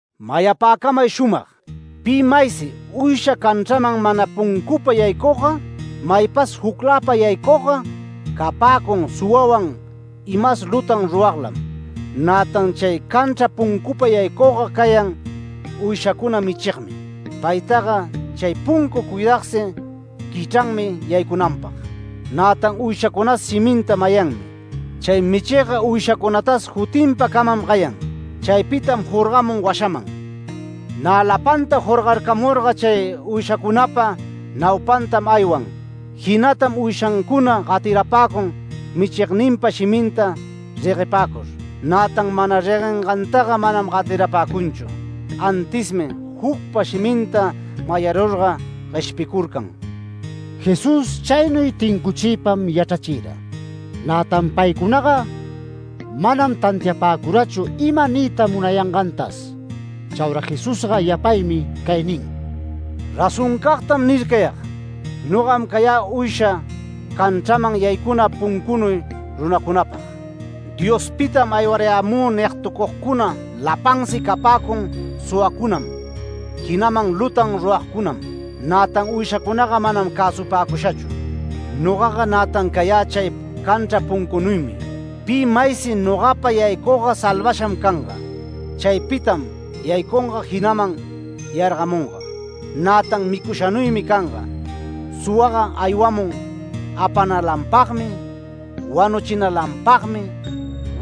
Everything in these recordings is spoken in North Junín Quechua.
“Mayapäcamay shumag: Pi maysi uysha canchraman mana puncupa yaycugga, maypas jucläpa yaycugga capäcun suwawan imas lutan ruraglam. Nätan chay canchra puncupa yaycugga cayan uyshacuna michigmi. Paytaga chay puncu cuidagsi quichranmi yaycunanpag, nätan uyshacunas shiminta mayanmi. Chay michigga uyshacunatas jutinpa camam gayan. Chaypitam jorgamun washaman. Nä lapanta jorgarcamurga chay uyshancunapa naupantam aywan. Jinatam uyshancuna gatirapäcun michigninpa shiminta reguepäcur. Nätan mana reguengantaga manam gatirapäcunchu, antismi jucpa shiminta mayarurga gueshpicurcan”. Jesús chaynuy tincuchiypam yachrachira. Nätan paycunaga manam tantiapäcurachu ima niyta munayangantas. Chaura Jesusga yapaymi cay nin: “Razoncagtam nircayag: Nogam cayä uysha canchraman yaycuna puncunuy runacunapag. ‘Diospitam aywarayämü’ nigtucugcuna lapansi capäcun suwacunam jinaman lutan ruragcunam. Nätan uyshacunaga manam cäsupäcushachu. Nogaga nätan cayä chay canchra puncunuymi. Pi maysi nogapa yaycugga salvasham canga. Chaypitam yaycunga jinaman yargamunga. Nätan micushanuymi canga. Suwaga aywamun apanalanpagmi, wanuchinalanpagmi,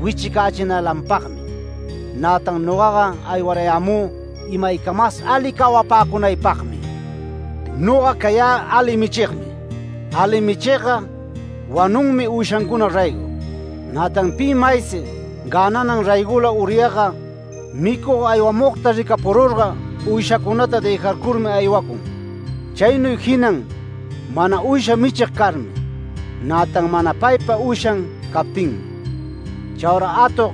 wichicächinalanpagmi. Nätan nogaga aywarayämü imaycamas ali cawapäcunaypagmi. Noga cayä ali michigmi. Ali michigga wanunmi uyshancuna raygo. Nätan pi maysi gänanan raygola uryagga, micug aywamugta ricapururga uyshacunata dëjarcurmi aywacun. Chaynuy jinan mana uysha michig carmi, nätan mana paypa uyshan captinmi. Chaura atog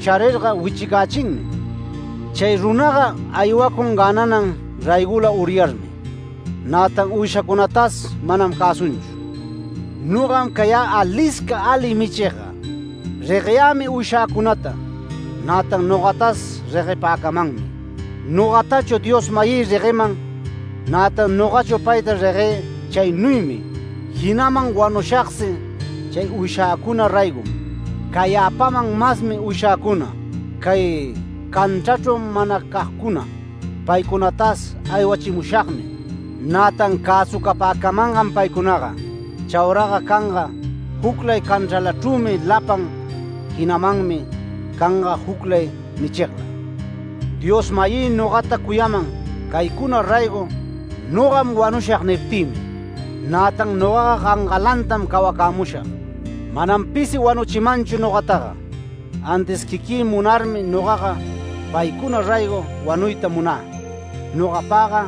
charirga wichicächinmi. Chay runaga aywacun gänanan raygola uryarmi, nätan uyshacunatas manam cäsunchu. Nogam cayä alisca ali michigga. Regueyämi uyshäcunata, nätan nogatas reguepäcamanmi. Nogatachu Dios-mayï regueman. Nätan nogachu payta reguë chaynuymi. Jinaman wanushagsi chay uyshäcuna raygom. Cayäpaman masmi uyshäcuna, cay canchrachru manacagcuna. Paycunatas aywachimushagmi, nätan cäsucapäcamangam paycunaga. Chauraga canga juclay canchralachrümi lapan, jinamanmi canga juclay michigla. Dios-mayï nogata cuyaman ‘Caycuna raygo nogam wanushag’ niptïmi. Nätan nogaga gangalantam cawacämushag. Manam pisi wanuchimanchu nogataga, antis quiquï munarmi nogaga paycuna raygo wanuyta munä. Nogapagga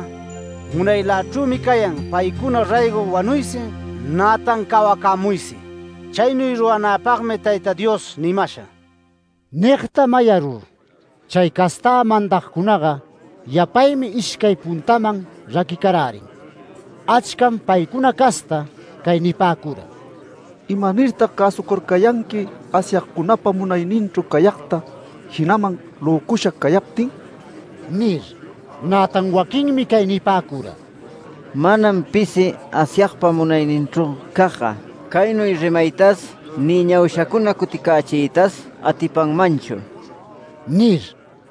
munaylachrümi cayan paycuna raygo wanuysi, nätan cawacämuysi. Chaynuy ruranäpagmi Tayta Dios nimasha”. Nigta mayarur chay castä mandagcunaga yapaymi ishcay puntaman raquicarärin. Achcam paycuna casta cay nipäcura: “¿Imanirtag cäsucurcayanqui Asyagcunapa munayninchru cayagta, jinaman löcusha cayaptin?” nir. Nätan waquinmi cay nipäcura: “Manam pisi Asyagpa munayninchru cagga, caynuy rimaytas ni ñaushacuna cuticächiytas atipanmanchu” nir.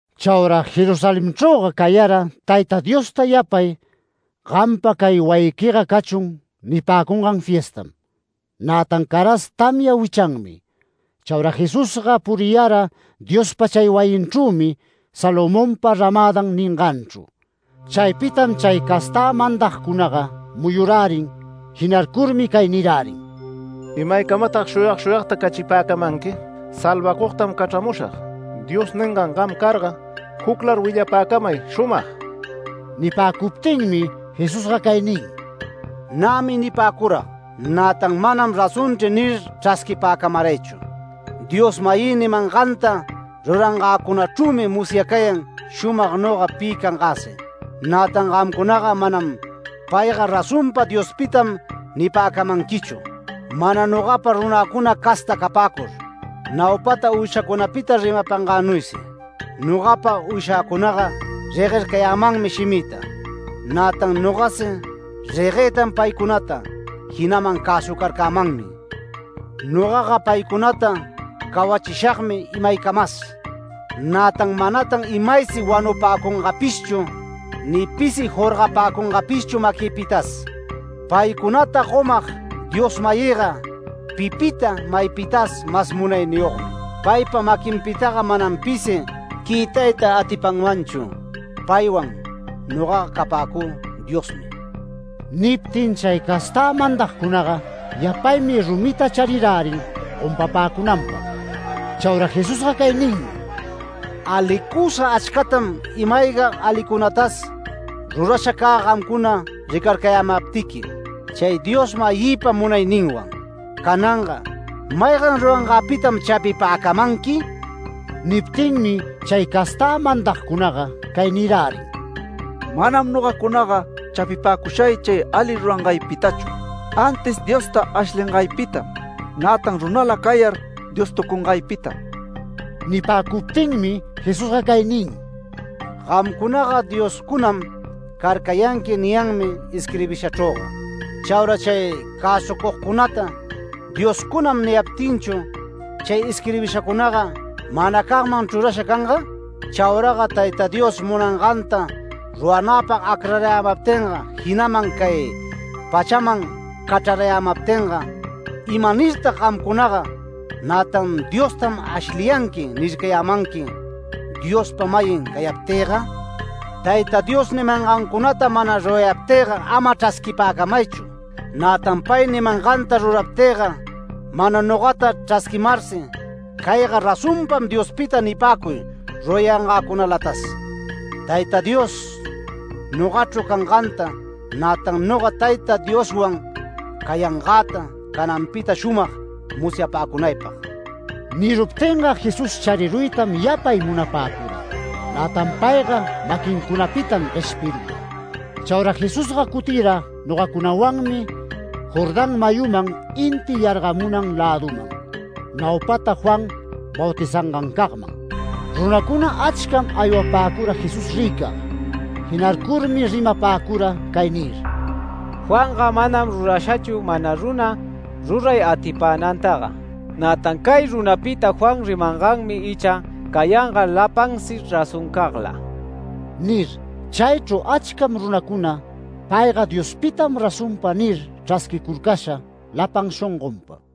Chaura Jerusalenchrüga cayara Tayta Diosta yapay ‘Gampa cay wayiquiga cachun’ nipäcungan fiestam. Nätan caras tamya wichanmi. Chaura Jesusga puriyara Diospa chay wayinchrümi Salomonpa ramädan ninganchru. Chaypitam chay castä mandagcunaga muyurärin jinarcurmi cay nirärin: “¿Imaycamatag shuyag shuyagta cachipäcamanqui? ‘Salvacugtam cachramushag’ Dios ningan gam carga juclar willapäcamay shumag”. Nipäcuptinmi Jesusga cay nin: “Nämi nipäcurag, nätan ‘Manam razonchri’ nir chrasquipäcamaraychu. Dios-mayï nimanganta rurangäcunachrümi musyacayan shumag noga pi cangäsi. Nätan gamcunaga manam ‘Payga razonpa Diospitam’ nipäcamanquichu, mana nogapa runäcuna casta capäcur, naupata uyshacunapita rimapangänuysi. Nogapa uyshäcunaga reguercayanmi shimïta. Nätan nogasi reguëtan paycunata, jinaman cäsucarcämanmi. Nogaga paycunata cawachishagmi imaycamas, nätan manatan imaysi wanupäcungapishchu ni pisi jorgapäcungapishchu maquïpitas. Paycunata gomag Dios-mayïga pipita maypitas mas munayniyogmi. Paypa maquinpitaga manam pisi quïtayta atipanmanchu. Paywan nogaga capäcü Diosmi”. Niptin chay castä mandagcunaga yapaymi rumita charirärin gompapäcunanpag. Chaura Jesusga cay ninmi: “Alicusa achcatam ima-ayga alicunatas rurasha cä gamcuna ricarcayämaptiqui chay Dios-mayïpa munayninwan. Cananga ¿maygan rurangäpitam chapipäcamanqui?” Niptinmi chay castä mandagcunaga cay nirärin: “Manam nogacunaga chapipäcushay chay ali rurangaycunapitachu, antis Diosta ashlingaypitam, nätan runala cayar Diostucungaypitam”. Nipäcuptinmi Jesusga cay nin: “Gamcunaga ‘dioscunam carcayanqui’ niyanmi isquirbishachrüga. Chaura chay cäsucugcunata ‘dioscunam’ niyaptinchu ¿chay isquirbishacunaga manacagman chrurasha canga? Chauraga Tayta Dios munanganta ruranäpag acrarayämaptinga, jinaman cay pachaman cachrarayämaptinga ¿imanirtag gamcunaga nätan ‘Diostam ashliyanqui’ nircayamanqui, Diospa-mayin cayaptïga? Tayta Dios nimangancunata mana rurayaptïga ama chrasquipäcamaychu. Nätan pay nimanganta ruraptïga, mana nogata chrasquimarsi ‘Cayga razonpa Diospitam’ nipäcuy, rurayangäcunalatas. Tayta Dios nogachru canganta, nätan noga Tayta Dioswan cayangäta cananpita shumag musyapäcunaypag”. Niruptinga Jesús chariruytam yapay munapäcura, nätan payga maquincunapitam gueshpirura. Chaura Jesusga cutira nogacunawanmi Jordán mayuman inti yargamun läduman, naupata Juan bautizangancagman. Runacuna achcam aywapäcura Jesús ricag. Jinarcurmi rimapäcura cay nir: “Juanga manam rurashachu mana runa ruray atipänantaga. Nätan cay runapita Juan rimanganmi icha cayanga lapansi razoncagla” nir. Chaychru achcam runacuna “Payga Diospitam razonpa” nir chrasquicurcasha lapan shongonpa.